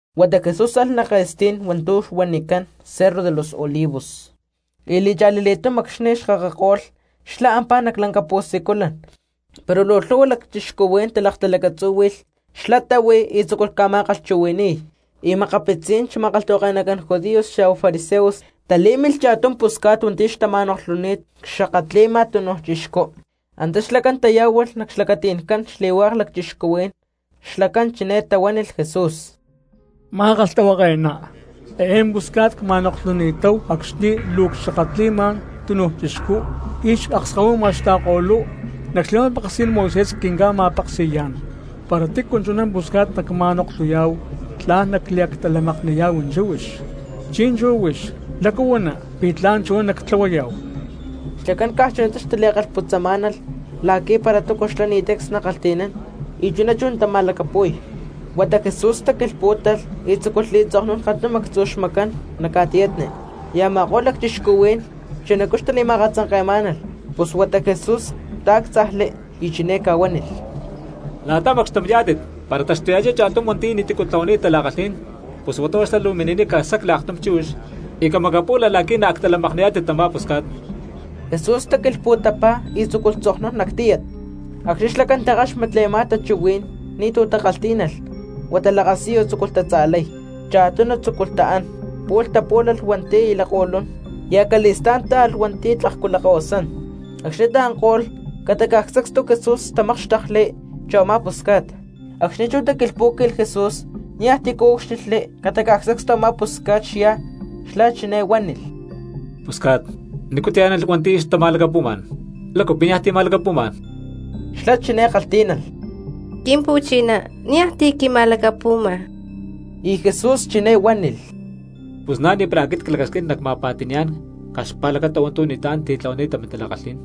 Huata Jesús alh nac ke̠stí̠n hua̠ntu̠ huanicán Cerro de los Olivos, y li̠cha̠li li̠túm acxni̠ xkakako̠lh xlá ampá nac lanca pu̠siculan. Pero luu lhu̠hua cristianos talaktalacatzúhui̠lh, xlá táhui y tzúculh ca̠ma̠kalhchuhui̠ni̠y. Y makapitzí̠n xma̠kalhtahuake̠nacán judíos xa̠hua fariseos talí̠milh cha̠tum pusca̠t hua̠nti̠ xtama̠noklhuni̠t cxakatli̠ma túnuj chixcú. Antá xlacán tayá̠hualh nac xlacati̠ncán xli̠hua̠k cristianos. Xlacán chiné tahuánilh Jesús: —Ma̠kalhtahuake̠ná, eé pusca̠t cma̠noklhuni̠táhu acxni̠ luu cxakatli̠ma túnuj chixcú y xakskahuima xta̠ko̠lú. Nac xli̠ma̠peksí̠n Moisés quinca̠li̠ma̠peksi̠yá̠n para tícu chuná pusca̠t nacma̠noklhuyá̠hu tla̠n nacliactalamakni̠yá̠hu chíhuix. Chi̠nchú huix, ¿lácu huana pi̠ tla̠n chuná nactlahuayá̠hu? Xlacán caj chunatá xtali̠kalhputzamá̠nalh la̠qui̠ para túcu xlá ni̠ tancs nakalhti̠nán y chuná chú natali̠ma̠lacapu̠y. Huata Jesús taquilhpú̠talh y tzúculh li̠tzoknún kantum actzu̠ xmacán nac ca̠tiyatni. Y a̠ma̠ko̠lh lacchixcuhuí̠n chunacú xtali̠ma̠katzanke̠má̠nalh, pus huata Jesús taáctzajli y chiné ca̠huánilh: —La̠ta macxtum yá̠tit, para taxtuya̠chá cha̠tum hua̠nti̠ ni̠túcu titlahuani̠t tala̠kalhí̠n, pus huata huá xlá luu mini̠niy casacli aktum chíhuix y camacapú̠lalh la̠qui̠ naactalamakni̠yá̠tit tamá pusca̠t. Jesús taquilhpu̠tapá y tzucupaj tzoknún nac tíyat. Acxni̠ xlacán takáxmatli a̠má tachuhuí̠n ni̠tu̠ takalhtí̠nalh huata lakasiyu tzúculh tatza̠lay, cha̠tunu tzúculh taán, pu̠lh tapú̠lalh hua̠nti̠ aya lakko̠lún y acali̠stá̠n táalh hua̠nti̠ tlakcu lakahuasán. Acxni̠ taanko̠lh ca̠ta sacstu Jesús tamákxtekli chu a̠má pusca̠t. Acxni̠ chú taquilhpú̠qui̠lh Jesús niaj tícu úcxilhli ca̠ta caj sacstu a̠má pusca̠t xyá, xlá chiné huánilh: —Pusca̠t, ¿nícu tayá̠nalh hua̠nti̠ xtama̠lacapu̠má̠n? ¿Lácu pi̠ niaj ti̠ ma̠lacapu̠má̠n? Xlá chiné kalhtí̠nalh: —Quimpu̠chiná, niaj ti̠ quima̠lacapu̠ma. Y Jesús chiné huánilh: —Pus na̠ ni̠para aquit clacasquín nacma̠pa̠ti̠ni̠yá̠n caj xpa̠lacata hua̠ntu̠ ni̠tlá̠n titlahuaní̠ta mintala̠kalhí̠n.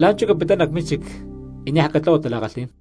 La̠nchú capittá nac mínchic, y niaj catlahua tala̠kalhí̠n.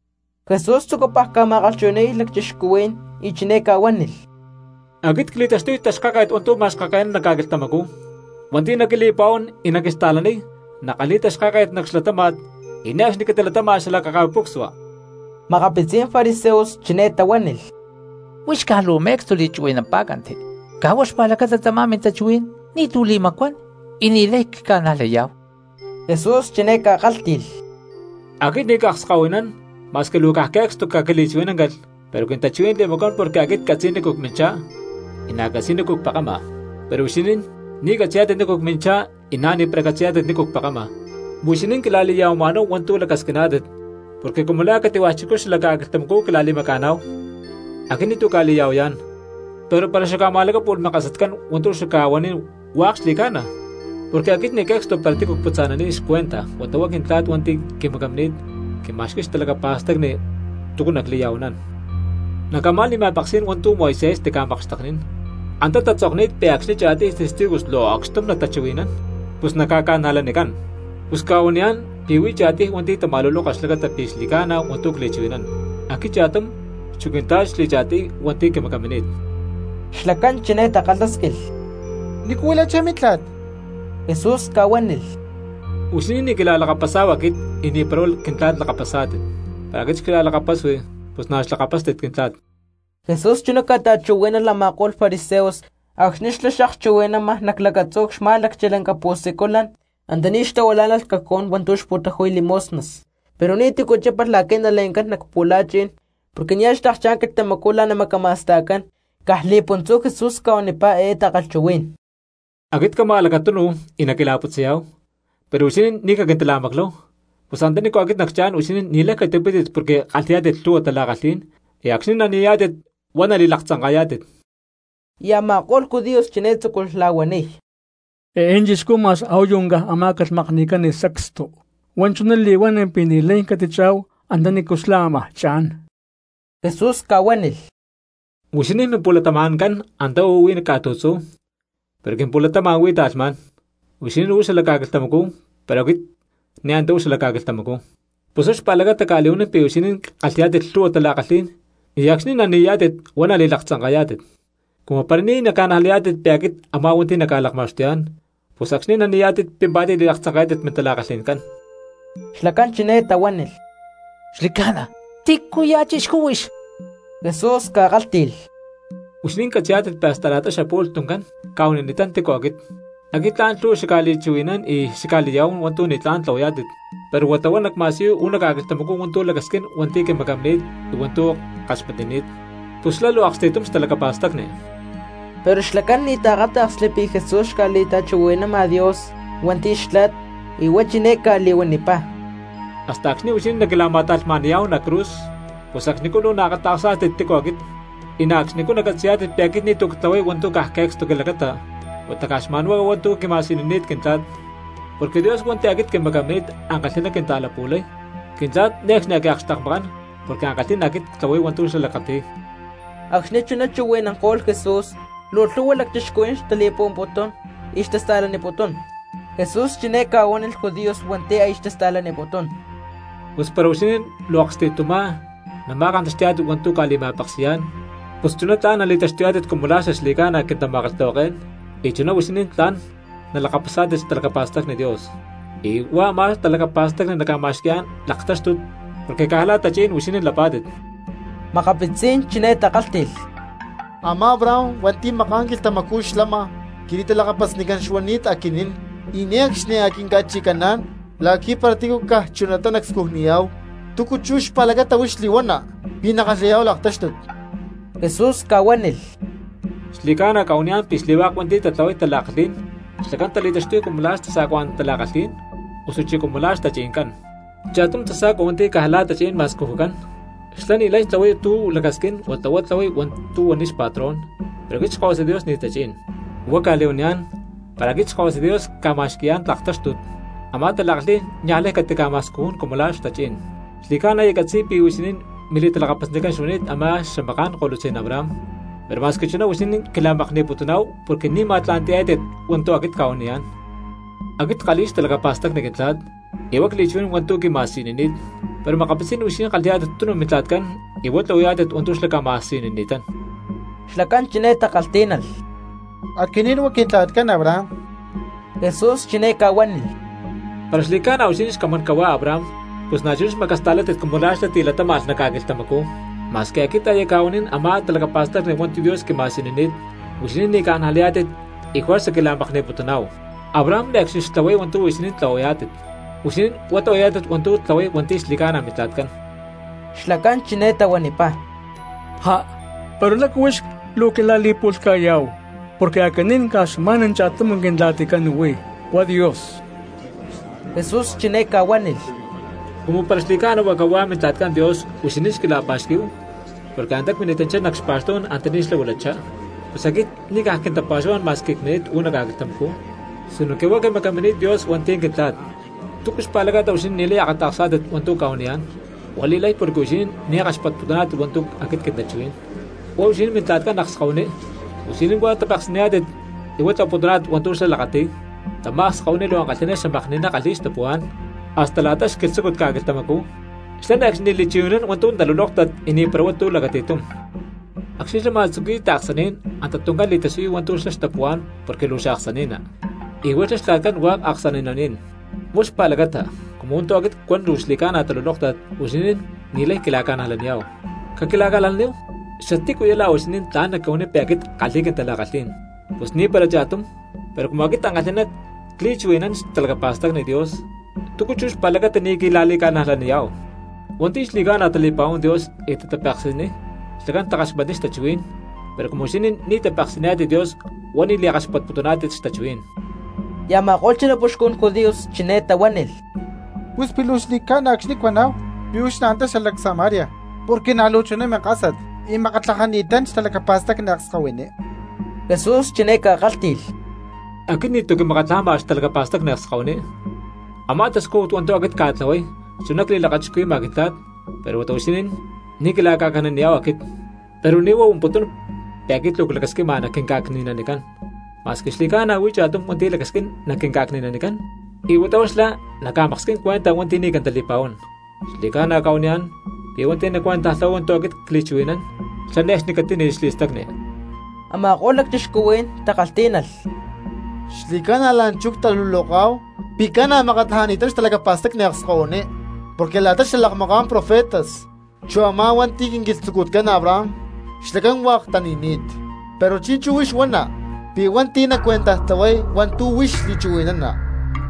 Jesús tzucupaj ca̠ma̠kalhchuhui̠ni̠y cristianos y chiné ca̠huánilh: —Aquit cli̠taxtuy taxkáket hua̠ntu̠ macaxkake̠nán nac ca̠quilhtamacú. Hua̠nti̠ naquili̠pa̠huán y naquista̠laniy nakalhi̠y taxkáket nac xlatáma̠t y ne̠cxni catilatáma̠lh xalakaca̠pucsua. Makapitzí̠n fariseos chiné tahuánilh: —Huix caj luu me̠cstu li̠chuhui̠nampá̠canti, caj huá xpa̠lacata tamá mintachuhuí̠n ni̠tu̠ li̠macuán y ni̠lay cca̠najlayá̠hu. Jesús chiné ca̠kálhti̠lh: —Aquit ni̠ cakskahuinán, ma̠squi luu caj que̠cstu caquili̠chuhui̠náncalh pero quintachuhuí̠n li̠macuán porque aquit ccatzi̠y nícu cminchá, y na̠ ccatzi̠y nícu cpekama. Pero huixinín ni̠ catzi̠yá̠tit nícu cminchá y na̠ ni̠para catzi̠yá̠tit nícu cpekama. Huixinín quila̠li̠ya̠huama̠náhu hua̠ntu̠ lacasquiná̠tit porque cumu la̠ cati̠hua̠ chixcú xala ca̠quilhtamacú quila̠li̠maca̠náhu. Aquit ni̠tu̠ cca̠li̠ya̠huayá̠n, pero para xacca̠ma̠lacápu̠lh minkasatcán, hua̠ntu̠ xacca̠huanín hua̠k xli̠ca̠na porque aquit ni̠ que̠cstu para tícu cputza̠naniy xcuentaj huata huá Quintla̠t hua̠nti̠ quimacamini̠t quima̠xqui̠y xtalacapa̠stacni túcu nacli̠ya̠huanán. Nac a̠má li̠ma̠peksí̠n hua̠ntu̠ Moisés tica̠makxteknín, antá tatzokni̠t pi̠ acxni̠ cha̠tiy testigos luu acxtum natachuhui̠nán, pus naca̠ca̠najlanicán. Pus cca̠huaniyá̠n pi̠ huí cha̠tiy hua̠nti̠ tama̠luloka xlacata pi̠ xli̠ca̠na hua̠ntu̠ cli̠chuhui̠nán, aquit cha̠tum, chu Quintla̠t xli̠cha̠tiy hua̠nti̠ quimacamini̠t. Xlacán chiné takalhásquilh: —¿Nícu huilachá mintla̠t? Jesús ca̠huánilh: —Huixinín ni̠ quila̠lakapasá̠hu aquit y ni̠para huá Quintla̠t lakapasá̠tit. Para aquit xquila̠lakapasui, pus na̠ xlakapástit Quintla̠t. Jesús chuná ca̠ta̠chuhuí̠nalh a̠ma̠ko̠lh fariseos acxni̠ xlá xakchuhui̠nama nac lacatzú xamá̠lacchi lanca pu̠siculan antaní xtahuilá̠nalh cajón hua̠ntu̠ xpu̠taju̠y limosnas. Pero ni̠tícu chípalh la̠qui̠ nale̠ncán nac pu̠la̠chi̠n porque nia̠ xlakchá̠n xquilhtamacú la̠ namacama̠sta̠cán. Caj li̠puntzú Jesús ca̠huanipá eé takalhchuhuí̠n: —Aquit cama a̠lacatunu y naquila̠putzayá̠hu, pero huixinín ni̠ caquintila̠macláhu; pus antanícu aquit nacchá̠n huixinín ni̠lay catipítit porque kalhi̠yá̠tit lhu̠hua tala̠kalhí̠n y acxni̠ nani̠yá̠tit huá nali̠laktzanka̠yá̠tit. Y a̠ma̠ko̠lh judíos chiné tzúculh la̠huaniy: —Eé chixcú ma̠x a̠huayu caj amá̠calh makni̠cán sacstu, huá chuná li̠huán pi̠ ni̠lay catichá̠hu antanícu xlá ámaj cha̠n. Jesús ca̠huánilh: —Huixinín mimpu̠latama̠ncán antá uú huí ca̠tu̠tzú, pero quimpu̠latama̠n huí ta̠lhmá̠n; huixinín uú xala ca̠quilhtamacú, pero aquit ni̠ antá uú xala ca̠quilhtamacú. Pus huá xpa̠lacata cca̠li̠huanín pi̠ huixinín kalhi̠yá̠tit lhu̠hua tala̠kalhí̠n y acxni̠ nani̠yá̠tit huá nali̠laktzanka̠yá̠tit. Cumu para ni̠ naca̠najlayá̠tit pi̠ aquit a̠má hua̠nti̠ naca̠lakma̠xtuyá̠n, pus acxni̠ nani̠yá̠tit pimpá̠tit li̠laktzanka̠yá̠tit mintala̠kalhi̠ncán. Xlacán chiné tahuánilh: —Xli̠ca̠na, ¿tícuya̠ chixcú huix? Jesús ca̠kálhti̠lh: —Huixinín catzi̠yá̠tit pi̠ hasta la̠ta xapu̠lh tuncán cca̠huanini̠tán tícu aquit. Aquit tla̠n lhu̠hua xacca̠li̠chuhui̠nán y xacca̠li̠ya̠huán hua̠ntu̠ ni̠tlá̠n tlahuayá̠tit, pero huata huá nacma̠siyuy uú nac ca̠quilhtamacú hua̠ntu̠ lacasquín hua̠nti̠ quimacamini̠t y hua̠ntu̠ ckaxmatnini̠t; pus xlá luu aksti̠tum xtalacapa̠stacni. Pero xlacán ni̠ taakáta̠ksli pi̠ Jesús xca̠li̠ta̠chuhui̠nama Dios hua̠nti̠ Xtla̠t, y huá chiné ca̠li̠huanipá: —Hasta acxni̠ huixinín naquila̠ma̠ta̠lhma̠ni̠yá̠hu nac cruz, pus acxnicú luu naakata̠ksá̠tit tícu aquit; y na̠ acxnicú nacatzi̠yá̠tit pi̠ aquit ni̠tu̠ ctlahuay hua̠ntu̠ caj que̠cstu quilacata, huata caj xma̠nhuá cuan hua̠ntu̠ quima̠siyunini̠t Quintla̠t. Porque Dios hua̠nti̠ aquit quimacamini̠t ankalhi̠ná quinta̠lapu̠lay, Quintla̠t ne̠cxni a̠ quiakxtekmakán porque ankalhí̠n aquit ctlahuay hua̠ntu̠ xlá lakati̠y. Acxni̠ chuná chuhui̠nanko̠lh Jesús, luu lhu̠hua cristianos xtali̠pa̠huamputún y xtasta̠laniputún. Jesús chiné ca̠huánilh judíos hua̠nti̠ aya xtasta̠laniputún: —Pus para huixinín luu aksti̠tumá nama̠kantaxti̠yá̠tit hua̠ntu̠ cca̠li̠ma̠peksi̠yá̠n pus chuná tla̠n nali̠taxtuyá̠tit cumu la̠ xaxli̠ca̠na quintama̠kalhtahuaké̠n, y chuná huixinín tla̠n nalakapasá̠tit xtalacapa̠stacni Dios, y huá a̠má talacapa̠stacni naca̠ma̠xqui̠yá̠n laktáxtut porque caj la̠ tachí̠n huixinín lapá̠tit. Makapitzí̠n chiné takálhti̠lh: —Amá Abraham hua̠nti̠ maká̠n quilhtamacú xlama quili̠talakapasnicán xuani̠t aquinín, y ne̠cxni a̠ quinca̠chi̠caná̠n la̠qui̠ para tícu caj chuná nacscujniyá̠hu. ¿Túcu chú xpa̠lacata huix li̠huana pi̠ nackalhi̠yá̠hu laktáxtut? Jesús ca̠huánilh: —Xli̠ca̠na cca̠huaniyá̠n pi̠ xli̠hua̠k hua̠nti̠ tatlahuay tala̠kalhí̠n xlacán tali̠taxtuy cumu la̠ xtasa̠cuacán tala̠kalhí̠n, osuchí cumu la̠ xtachi̠ncán. Cha̠tum tasa̠cua hua̠nti̠ caj la̠ tachí̠n ma̠scujucán, xlá ni̠lay tlahuay tu̠ lacasquín huata huá tlahuay hua̠ntu̠ huaniy xpatrón, pero aquit Xkahuasa Dios ni̠ tachí̠n. Huá cca̠li̠huaniyá̠n, para aquit Xkahuasa Dios cca̠ma̠xqui̠yá̠n laktáxtut, a̠má tala̠kalhí̠n niaj lay cataca̠ma̠scujún cumu la̠ xtachí̠n. Xli̠ca̠na aya ccatzi̠y pi̠ huixinín mili̠talakapasnicán xuani̠t a̠má xamaká̠n kolutzí̠n Abraham, pero ma̠squi chuná huixinín quila̠makni̠putuná̠hu porque ni̠ ma̠tla̠nti̠yá̠tit hua̠ntu̠ aquit cca̠huaniyá̠n. Aquit ckalhi̠y xtalacapa̠stacni Quintla̠t y huá cli̠chuhui̠nán hua̠ntu̠ quima̠siyunini̠t, pero makapitzí̠n huixinín kalhi̠yá̠tit tunu mintla̠tcán y huá tlahuayá̠tit hua̠ntu̠ xlá ca̠ma̠siyunini̠tán. Xlacán chiné takalhtí̠nalh: —Aquinín huá quintla̠tcán Abraham. Jesús chiné ca̠huánilh: —Para xli̠ca̠na huixinín xcamán cahuá Abraham pus na̠chuná xmacasta̠látit cumu la̠ xlá tilatáma̠lh nac ca̠quilhtamacú. Ma̠squi aquit aya cca̠huanín a̠má talacapa̠stacni hua̠ntu̠ Dios quima̠siyunini̠t, huixinín ni̠ ca̠najlayá̠tit y juerza quila̠makni̠putuná̠hu. Abraham ne̠cxni xtlahuay hua̠ntu̠ huixinín tlahuayá̠tit. Huixinín huá tlahuayá̠tit hua̠ntu̠ tlahuay hua̠nti̠ xli̠ca̠na mintla̠tcán. Xlacán chiné tahuanipá: —¡Já, pero lácu huix luu quila̠li̠pu̠lhca̠yá̠hu! Porque aquinín caj xma̠n cha̠tum Quintla̠ticán huí huá Dios. Jesús chiné ca̠huánilh: —Cumu para xli̠ca̠na huá cahuá Mintla̠ticán Dios huixinín xquila̠pa̠xquí̠hu, porque antá cmini̠tanchá nac xpa̠xtú̠n antaní xlá huilachá; pus aquit ni̠ caj quintapa̠xuhuá̠n ma̠squi cmini̠t uú nac ca̠quilhtamacú, sinoque huá quimacamini̠t Dios hua̠nti̠ Quintla̠t. ¿Túcu xpa̠lacata huixinín ni̠lay akata̠ksá̠tit hua̠ntu̠ cca̠huaniyá̠n? Huá li̠lay porque huixinín ni̠ kaxpatputuná̠tit hua̠ntu̠ aquit quintachuhuí̠n. Huá huixinín mintla̠tcán akskahuiní; huixinín huá tapeksi̠niyá̠tit y huá tlahuaputuná̠tit hua̠ntu̠ xlá lakati̠y. Tamá akskahuiní luu ankalhi̠ná xamakni̠ná kalhi̠y xtapuhuá̠n hasta la̠ta xquilhtzúcut ca̠quilhtamacú. Xlá ne̠cxni li̠chuhui̠nán hua̠ntu̠ talulóktat y ni̠para hua̠ntu̠ lacati̠tum. Acxni̠ xlá ma̠tzuqui̠y xtaaksaní̠n anta tuncán li̠tasiyuy hua̠ntu̠ xlá xtapuhuá̠n porque luu xaaksani̠ná, y huá xlá xtla̠tcán hua̠k aksani̠naní̠n. Huá xpa̠lacata, cumu hua̠ntu̠ aquit cuan luu xli̠ca̠na talulóktat, huixinín ni̠lay quila̠ca̠najlaniyá̠hu. Caquila̠huaníhu, ¿xatícuya̠ la̠ huixinín tla̠n naquihuaniy pi̠ aquit ckalhi̠y quintala̠kalhí̠n? Pus ni̠para cha̠tum. Pero cumu aquit ankalhi̠ná cli̠chuhui̠nani̠t xtalacapa̠stacni Dios, ¿túcu chú xpa̠lacata ni̠ quila̠li̠ca̠najlaniyá̠hu? Hua̠nti̠ xli̠ca̠na tali̠pa̠huán Dios y tatapeksi̠niy xlacán takaxmatniy xtachuhuí̠n, pero cumu huixinín ni̠ tapeksi̠niyá̠tit Dios huá ni̠ li̠kaxpatputuná̠tit xtachuhuí̠n. Y a̠ma̠ko̠lh xanapuxcun judíos chiné tahuánilh: —Pus pi̠ luu xli̠ca̠na acxni̠ cuaná̠hu pi̠ huix na̠ antá xalac Samaria porque na̠ luu chuná minkásat y makatlajani̠tán xtalacapa̠stacni akskahuiní. Jesús chiné ca̠kálhti̠lh: —Aquit ni̠tu̠ quimakatlajama xtalacapa̠stacni akskahuiní. Amá tascújut hua̠ntu̠ aquit cca̠tlahuay chuná cli̠lakachixcuhui̠ma Quintla̠t, pero huata huixinín ni̠ quila̠ca̠cni̠naniyá̠hu aquit. Pero ni̠ huá huamputún pi̠ aquit luu clacasquima naquinca̠cni̠nanicán, ma̠squi xli̠ca̠na huí cha̠tum hua̠nti̠ lacasquín naquinca̠cni̠nanicán, y huata huá xlá naca̠maksquín cuenta hua̠nti̠ ni̠ quintali̠pa̠huán. Xli̠ca̠na cca̠huaniyá̠n pi̠ hua̠nti̠ nacuentajtlahuay hua̠ntu̠ aquit cli̠chuhui̠nán xlá ne̠cxni catíni̠lh xli̠stacni. Ama̠ko̠lh cristianos takalhtí̠nalh: —Xli̠ca̠na la̠nchú luu ctaluloká̠hu pi̠ ca̠na makatlajani̠tán xtalacapa̠stacni akskahuiní, porque la̠ta xalakmaká̠n profetas chu a̠má hua̠nti̠ quinquilhtzucutcán Abraham xlacán hua̠k tani̠ni̠t; pero chi̠nchú huix huana pi̠ hua̠nti̠ nacuentajtlahuay hua̠ntu̠ huix li̠chuhui̠nana,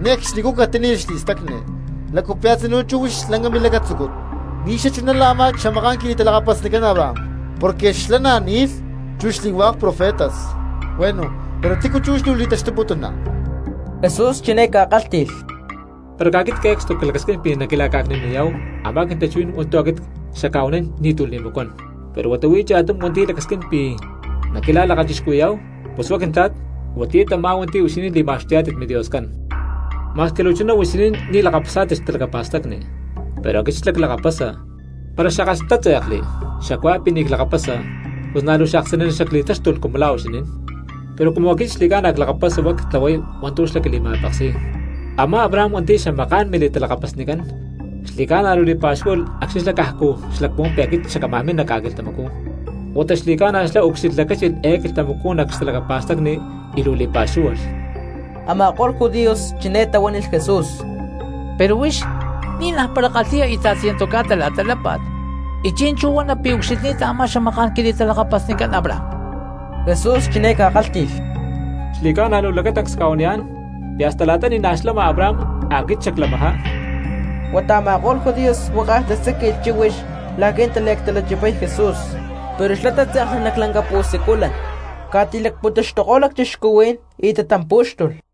ne̠cxni catíni̠lh xli̠stacni. ¿Lácu pi̠ a̠tzinú chú huix lanca milacatzúcut ni̠ xachuná la̠ a̠má xamaká̠n quili̠talakapasnicán Abraham? Porque xlá na̠ ni̠lh chu xli̠hua̠k profetas. Bueno, pero ¿tícu chú huix luu li̠taxtuputuna? Jesús chiné ca̠kálhti̠lh: —Para caj aquit que̠cstu clacasquín pi̠ naquila̠ca̠cni̠naniyá̠hu a̠má quintachuhuí̠n hua̠ntu̠ aquit xacca̠huanín ni̠tu̠ li̠macuán. Pero huata huí cha̠tum hua̠nti̠ lacasquín pi̠ naquila̠lakachixcuhui̠yá̠hu, pus huá Quintla̠t, huatiyá tamá hua̠nti̠ huixinín li̠ma̠xtuyá̠tit MiDioscán. Ma̠squi luu chuná chú huixinín ni̠ lakapasá̠tit xtalacapa̠stacni, pero aquit xlá clakapasa. Para xackalhtátze̠kli xacuá pi̠ ni̠ clakapasa, pus na̠ luu xaaksani̠ná xacli̠táxtulh cumu la̠ huixinín. Pero cumu aquit xli̠ca̠na clakapasa huá cca̠li̠tlahuay hua̠ntu̠ xlá quili̠ma̠peksi̠y. Amá Abraham hua̠nti̠ xamaká̠n mili̠talakapasnicán xli̠ca̠na luu li̠pa̠xúhualh acxni̠ xlá cajcu xlacpuhuán pi̠ aquit xacámaj min nac ca̠quilhtamacú, huata xli̠ca̠na xlá ucxilhlacáchilh eé quilhtamacú nac xtalacapa̠stacni y luu li̠pa̠xúhualh. Ama̠ko̠lh judíos chiné tahuánilh Jesús: —Pero huix ni̠naj para kalhi̠ya íta̠t ciento ca̠ta la̠ta lápa̠t, ¿y chi̠nchú huana pi̠ ucxilhni̠ta a̠má xamaká̠n quili̠talakapasni Abraham? Jesús chiné ca̠kálhti̠lh: —Xli̠ca̠na luu lacatancs cca̠huaniyá̠n, pi̠ hasta la̠ta ni̠najtí xlama Abraham aquit xaclamajá. Huata a̠ma̠ko̠lh judíos huákaj tasáqui̠lh chíhuix la̠qui̠ nataliactalanchipay Jesús; pero xlá tátze̠kli nac lanca pu̠siculan, ca̠ti̠lacpuntaxtuko̠lh cristianos y tatampú̠xtulh.